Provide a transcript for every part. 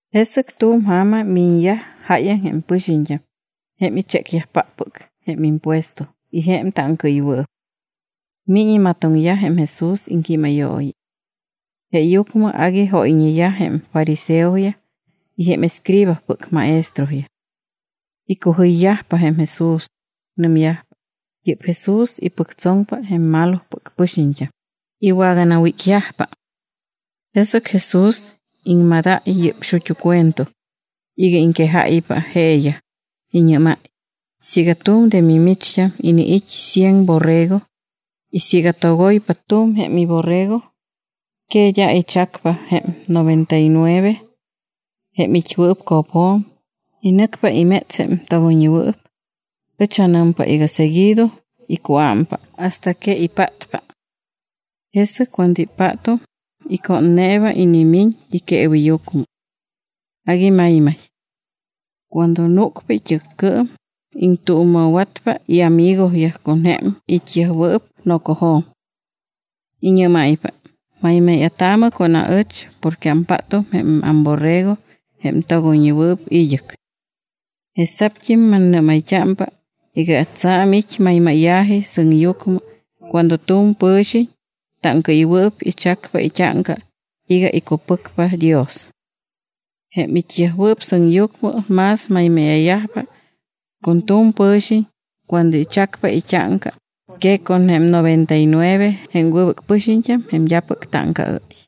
Jesɨc tu̱m ja̱ma miñyaj jáyaŋ jém pɨxiñt́am jém ichécyajpáppɨc jém impuesto y jém táŋcaɨywɨɨp. Miñ imatoŋyaj jém Jesús iŋquímayooyi. Jeeyucmɨ agui jóyñeyaj jém fariseoyaj y jém escribaspɨc maestroyaj. Icujɨyyajpa jém Jesús. Nɨmyajpa: —Yɨ́p Jesús ipɨctsoŋpa jém malopɨc pɨxiñt́am, iwaganawícyajpa. Jesɨc Jesús iŋmadáy yɨ́p xut́u cuento iga iŋquejáypa jeeyaj, iñɨ́máy: —Siiga tu̱m de mimicht́am iniit́ cien borrego y siiga togoypa tu̱m jém iborrego, ¿que d́a ichacpa jém noventa y nueve jém it́wɨɨp co̱pjo̱m y nɨcpa iméts jém togoyñewɨɨp? Ɨch anɨmpa iga seguido icuámpa hasta que ipátpa. Jesɨc cuando ipátum, icónneeba inimiñ iqueeweyucmɨ. Agui maymay. Cuando núcpa it́ɨccɨɨm, iŋtuuma̱watpa iamigoyaj con jém it́yajwɨɨp nocojo̱m. Iñɨ́máypa: “Maymáya̱taamɨ con aɨch, porque ampátum jém amborrego jém togoyñewɨɨp id́ɨc.” Jesa̱pt́im mannɨ́mayt́ámpa iga tsa̱m it́ maymáya̱ji sɨŋyucmɨ cuando tu̱m pɨ̱xiñ táŋcaɨywɨɨp ichacpa it́áŋca iga icupɨcpa Dios. Jém it́yajwɨɨp sɨŋyucmɨ más maymáya̱yajpa con tu̱m pɨ̱xiñ cuando ichacpa it́áŋca que con jém noventa y nueve jém wɨbɨc pɨxiñt́am jém d́apɨc táŋcaɨ́y.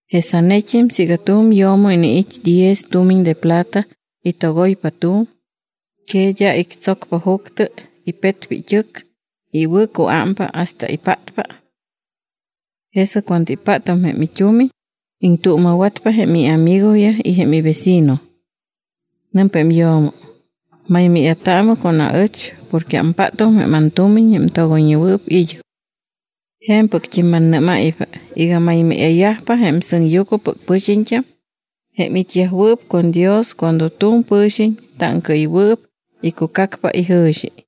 ’Jesanet́im siiga tu̱m yo̱mo iniit́ diez tumiñ de plata y togoypa tu̱m, ¿que d́a ictsocpa juctɨ, ipetpa it́ɨc y iwɨ̱cuámpa hasta ipátpa? Jesɨc cuando ipátum jém it́umiñ, iŋtuuma̱watpa jém iamigoyaj y jém ivecino. Nɨmpa jém yo̱mo: “Maymáya̱taamɨ con aɨch porque ampátum jém antumiñ jém togoyñewɨɨp id́ɨc.” ’Je̱mpɨct́im mannɨ́máypa iga maymáya̱yajpa jém sɨŋyucmɨpɨc pɨxiñt́am jém it́yajwɨɨp con Dios cuando tu̱m pɨ̱xiñ táŋcaɨywɨɨp icucacpa ijɨ̱xi.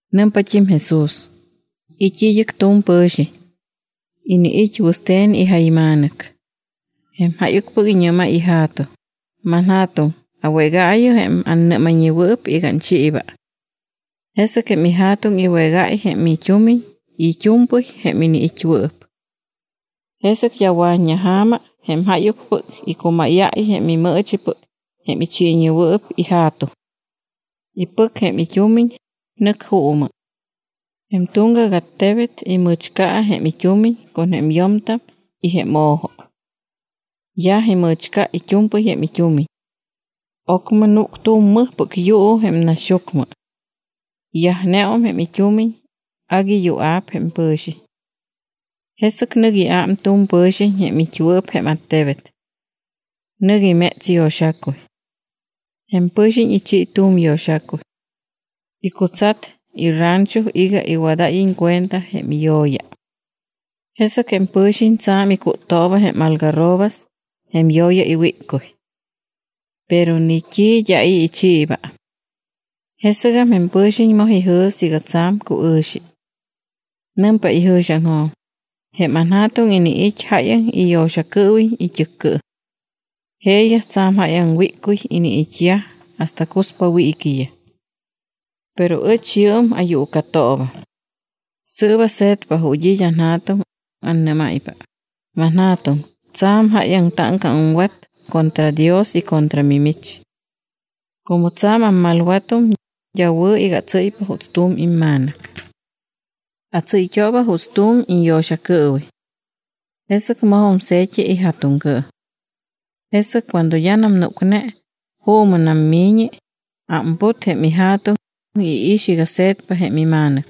Nɨmpat́im Jesús: —It́ id́ɨc tu̱m pɨ̱xiñ. Iniit́ wɨste̱n ijayma̱nɨc. Jém jáyucpɨc iñɨ́máy ija̱tuŋ: “Manja̱tuŋ, awégaayɨ jém annɨ́mayñewɨɨp iga anchiiba.” Jesɨc jém ija̱tuŋ iwégáy jém it́umiñ y it́u̱mpɨy jém iniit́wɨɨp. Jesɨc d́a wa̱t́ña ja̱ma jém jáyucpɨc icumáyáy jém imɨɨchipɨc jém ichiiwɨɨp ija̱tuŋ. Ipɨc jém it́umiñ, nɨc juumɨ. Jém tuŋgac attebet imɨ̱chca jém it́umiñ con jém yo̱mtam y jém o̱jo. Yaj imɨ̱chca it́u̱mpɨy jém it́umiñ. Ocmɨ núc tu̱m mɨjpɨc yuu jém naxyucmɨ. Yajneum jém it́umiñ, agui yua̱p jém pɨ̱xiñ. Jesɨc nɨc iám tu̱m pɨ̱xiñ jém it́wɨɨp jém attebet. Nɨc iméts yo̱xacuy. Jém pɨ̱xiñ ichi tu̱m yo̱xacuy. Icutsat irancho iga iwadáyiñ cuenta jém iyo̱ya. Jesɨc jém pɨ̱xiñ tsa̱m icúttooba jém algarrobas, jém yo̱ya iwíccuy. Pero ni t́i d́a i̱ ichiiba. Jesɨgam jém pɨ̱xiñ moj ijɨ̱s iga tsa̱m cuɨ̱xi. Nɨmpa ijɨ̱xiaŋjo̱m: “Jém anja̱tuŋ iniit́ jáyaŋ iyo̱xacɨɨwiñ it́ɨccɨɨm. Jeeyaj tsa̱m jáyaŋ wíccuy iniit́yaj hasta cuspa wiiquiyaj. Pero ɨch yɨɨm ayuucatoobam. Sɨɨp ase̱tpa ju̱t́ it́ anja̱tuŋ, annɨ́máypa: Manja̱tuŋ, tsa̱m jáyaŋ táŋca aŋwat contra Dios y contra mimich. Como tsa̱m ammalwatum, d́a wɨ̱ iga atsɨ́ypa juuts tu̱m imma̱nɨc. Atsɨ́yt́ooba juuts tu̱m iñyo̱xacɨɨwiñ.” Jesɨc mojum se̱t́i ija̱tuŋcɨɨm. ’Jesɨc cuando d́anam núcne, juumɨnam miñi, ámput jém ija̱tuŋ, iix iga se̱tpam jém ima̱nɨc.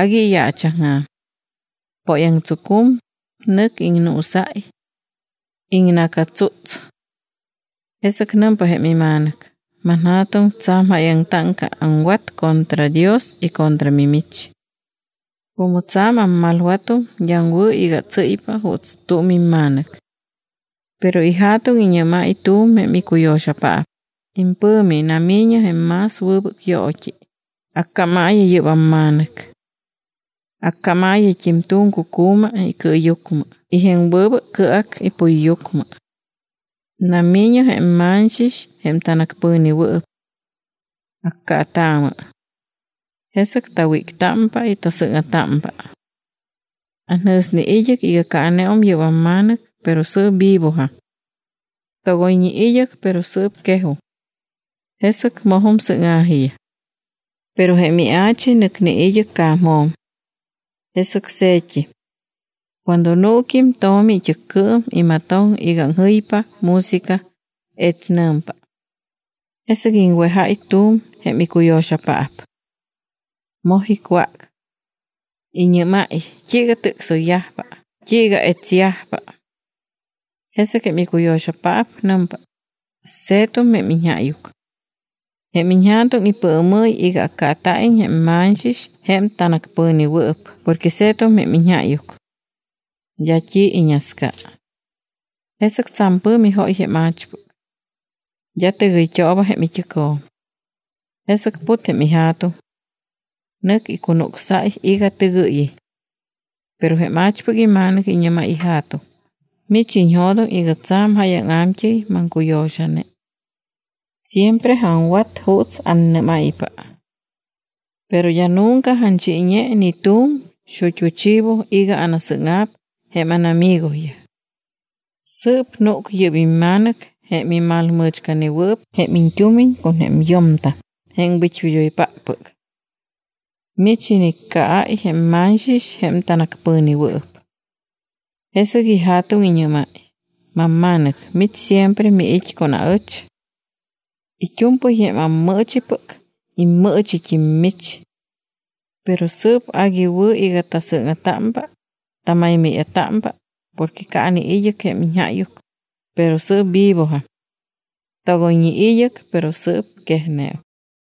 Agui iyaachaŋja̱m. Póyaŋtsucum, nɨc iŋnuusáy. Iŋna̱catsúts. Jesɨc nɨmpa jém ima̱nɨc: “Manja̱tuŋ, tsa̱m jáyaŋ táŋca aŋwat contra Dios y contra mimich. Como tsa̱m ammalwatum d́am wɨ̱ iga atsɨ́ypa juuts tu̱m imma̱nɨc.” Pero ija̱tuŋ iñɨ́máy tu̱m jém icuyo̱xapaap: “Impɨ̱mi nami̱ñɨ jém más wɨbɨc yoot́i, accámaayɨ yɨ́p amma̱nɨc. Accámaayɨt́im tu̱m cucu̱ma icɨɨyucmɨ y jém wɨbɨc cɨac ipuyyucmɨ. Nami̱ñɨ jém ma̱ñxix jém tanacpɨ̱newɨɨp. Accaataamɨ. Jesɨc tawíctámpa, tasɨ́ŋa̱támpa. Anjɨ̱sne id́ɨc iga caaneum yɨ́p amma̱nɨc, pero sɨɨp vivojam. Togoyñe id́ɨc, pero sɨɨp quejum.” Jesɨc mojum sɨ́ŋa̱jiyaj. ’Pero jém ia̱chi nɨcne id́ɨc ca̱mjo̱m. Jesɨc se̱tt́im. Cuando nuuquim tomi it́ɨccɨɨm, imatoŋ iga aŋjɨypa música, etsnɨ̱mpa. Jesɨc iŋwejáy tu̱m jém icuyo̱xapaap. Moj icwác. Iñɨ́máy: “¿T́iiga tɨcsoyyajpa? ¿T́iiga etsyajpa?” Jesɨc jém icuyo̱xapaap nɨmpa: “Se̱tum jém iñjáyuc. Jém iñja̱tuŋ ipɨɨmɨ́y iga accaata̱iñ jém ma̱ñxix jém tanacpɨ̱newɨɨp porque se̱tum jém iñjáyuc. D́a t́i iñasca.” Jesɨc tsa̱m pɨ̱mi jóy jém a̱chpɨc. D́a tɨgɨyt́ooba jém it́ɨcjo̱m. Jesɨc put jém ija̱tuŋ. Nɨc icunucsáy iga tɨgɨ́yiñ. Pero jém a̱chpɨc ima̱nɨc iñɨ́máy ija̱tuŋ: “Mich iñjo̱doŋ iga tsa̱m jáyaŋ a̱mt́ɨy maŋcuyo̱xane. Siempre aŋwat juuts annɨ́máypa. Pero d́a nunca anchiiñe ni tu̱m xut́u chivo iga anasɨ́ŋa̱p jém ánamigoyaj. Sɨɨp núc yɨ́p imma̱nɨc jém imalmɨ̱chcanewɨɨp jém iñt́umiñ con jém yo̱mtam jém wit́wid́oypáppɨc. Mich iniccaáy jém ma̱ñxix jém tanacpɨ̱newɨɨp.” Jesɨc ija̱tuŋ iñɨ́máy: “Mamma̱nɨc, mich siempre miit́ con aɨch. It́u̱mpɨy jém ammɨɨchipɨc, immɨɨchit́im mich. Pero sɨɨp agui wɨ̱ iga tasɨ́ŋa̱támpa, tamaymáya̱támpa porque caane id́ɨc jém iñjáyuc, pero sɨɨp vivojam. Togoyñe id́ɨc, pero sɨɨp quejneum.”